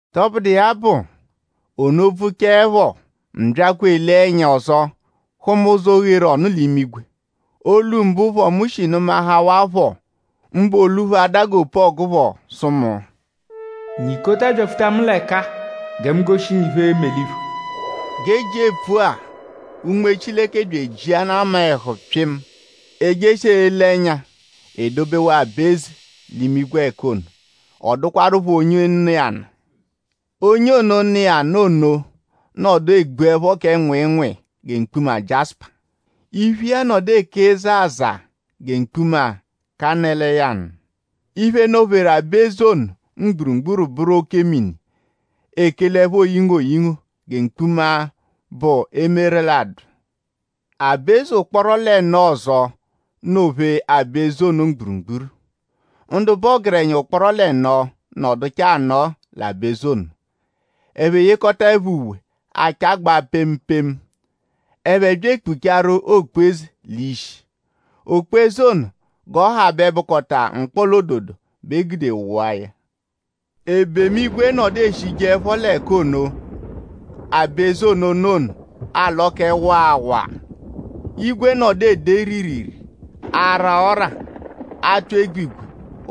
Tọbudu iya bụ; ono bvụchaepho mu byakwa elee ẹnya ọzo; hụma ụzo, gheru ọnu l'imigwe. Olu mbụ phọ, mu shi nụmahawaa phọ; mbụ olu phọ l'ada g'opu-ọgu phọ; sụ mu: “Nyikota byakpọdapho l'ẹka gẹ mu goshi ngu iphe, e-me l'iphu.” G'e jia epfua Unme Chileke bya ejiana mu-a ẹhu pyịmu. E jeshia ele ẹnya; e dobewaa aba-eze l'imigwe l'ẹka ono. Ọ dụkwarupho onye nọ iya nụ. Onye ono, nọ iya nụ ono nọdu egbuẹpho kẹ nwịinwii gẹ mkpuma jiásùpà. Iphu iya nọdu eke zaazaa gẹ mkpuma kanélìyànù. Iphe nọ-pheru aba-eze ono mgburugburu bụru ẹko-mini, ekelẹpho oyingo oyingo gẹ mkpuma, bụ emeralụdu. Aba-eze ụkporo l'ẹno ọzo nọ-phee aba-eze ono mgburugburu. Ndu bụ ọgerenya ụkporo l'ẹno nọduchaa anọ l'aba-eze ono. Ẹphe yekọtaepho uwe, achagbaa pemu pemu. Ẹphe bya ekpugbaaru okpu-eze l'ishi. Okpu-eze ono g'ọ ha bẹ bụkota mkpọla-ododo bẹ e gude wụa ya. Ebemu-igwe nọdu eshijeẹpho l'ẹka ono, aba-eze ono nọ ono alọ kẹ waa waa. Igwe nọdu ede riiriirii; ara ọ́rà; atụ egbigwe.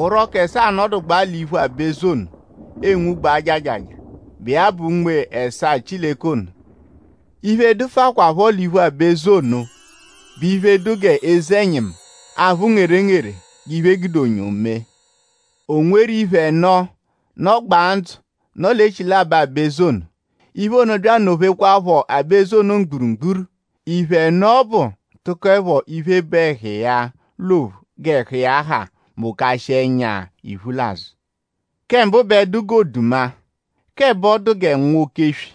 Orọku ẹsaa nọdugbaa l'iphu aba-eze ono enwugbaa jajaja, bụ iya bụ Unme ẹsaa Chileke ono. Iphe, dụfukwaapho l'iphu aba-eze ono bụ iphe, dụ g'eze-ẹnyimu, aphụ ngerengere g'iphe, e gude onyo mee. O nweru iphe ẹno, nọgbaa ndzụ nọ l'echilabọ aba-eze ono. Iphe ono bya anọ-phekwaaphọ aba-eze ono mgburugburu. Iphe ẹno ọbu tụkoepho iphe, bụ ẹhu iya l'ophu g'ẹhu iya ha mokashịa ẹnya ẹnya; iphu l'azụ. Kẹ mbụ bẹ dụ g'oduma; k'ẹbo dụ gẹ nwa oke-eswi;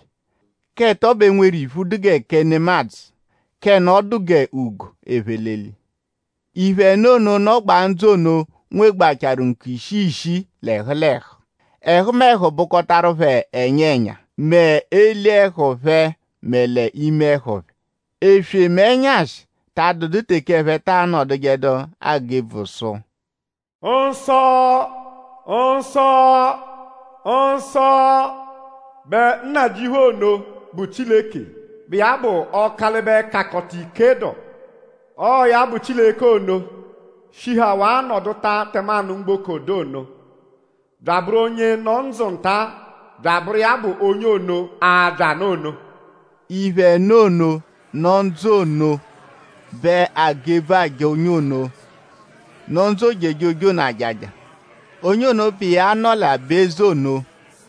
k'ẹto bẹ nweru iphu dụ gẹ kẹ nemadzụ; k'ẹno dụ g'ugo, ephe l'eli. Iphe ẹno ono, nọgbaa ndzụ ono nwegbachaaru ǹkù ishii ishii l'ẹhu l'ẹhu. Ẹhumehu bụkotaru phẹ ẹnya ẹnya mẹ eli ẹhu phẹ mẹ l'ime ẹhu phẹ. Eswe mẹ ẹnyashi ta adụdu teke ẹphe ta anọdujedu agụ ebvu sụ: “Nsọ! Nsọ! Nsọ! bẹ Nnajịuphu ono, bụ Chileke, bụ iya bụ Ọkalibe-Kakọta-Ike dụ. Ọo ya bụ Chileke ono, shihawaa nọduta tẹmanu mgboko dụ ono; bya abụru onye nọ ndzụ nta bya abụru iya bụ onye ono, abya nụ ono.” Iphe ẹno ono, nọ ndzụ ono bẹ agụ ebvu aja onye ono, nọ ndzụ ojejoje ono ajaja; onye ono, bụ iya nọ l'aba-eze ono;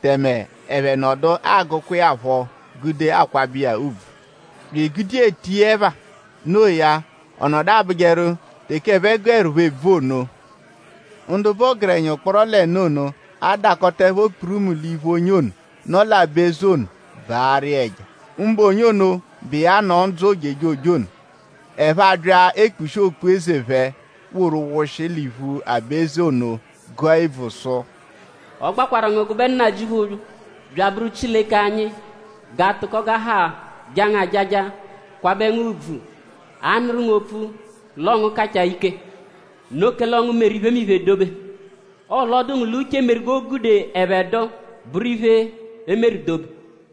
tẹme ẹphe nọdu agụkwa iya phọ gude akwabẹ iya ùbvù; bya egude iya etu iya ẹpha. No iya; ọ nọdu abụjeru teke ẹphe gụerupho ebvu ono; ndu bụ ọgerenya ụkporo l'ẹno ono adakọtaepho kpurumu l'iphu onye ono, nọ l'aba-eze ono baarụ iya ẹja; mbụ onye ono, bụ iya nọ ndzụ ojejoje ono. Ẹphe abya ekpushia okpu-eze phẹ woru wụshi l'iphu aba-eze ono gụa ebvu sụ: “Ọ gbakwarụ ngu gụbe Nnajịuphu bya abụru Chileke anyi; g'aatụko g'a ha jaa ngu ajaja; kwabẹ ngu ùbvù; anụru ngu opfu l'ọo ngu kachaa ike. Noo kẹle ọo ngu meru iphemiphe dobe. Ọo l'ọ dụ ngu l'uche meru g'o gude ẹphe dụ; bụru iphe, e meru dobe.”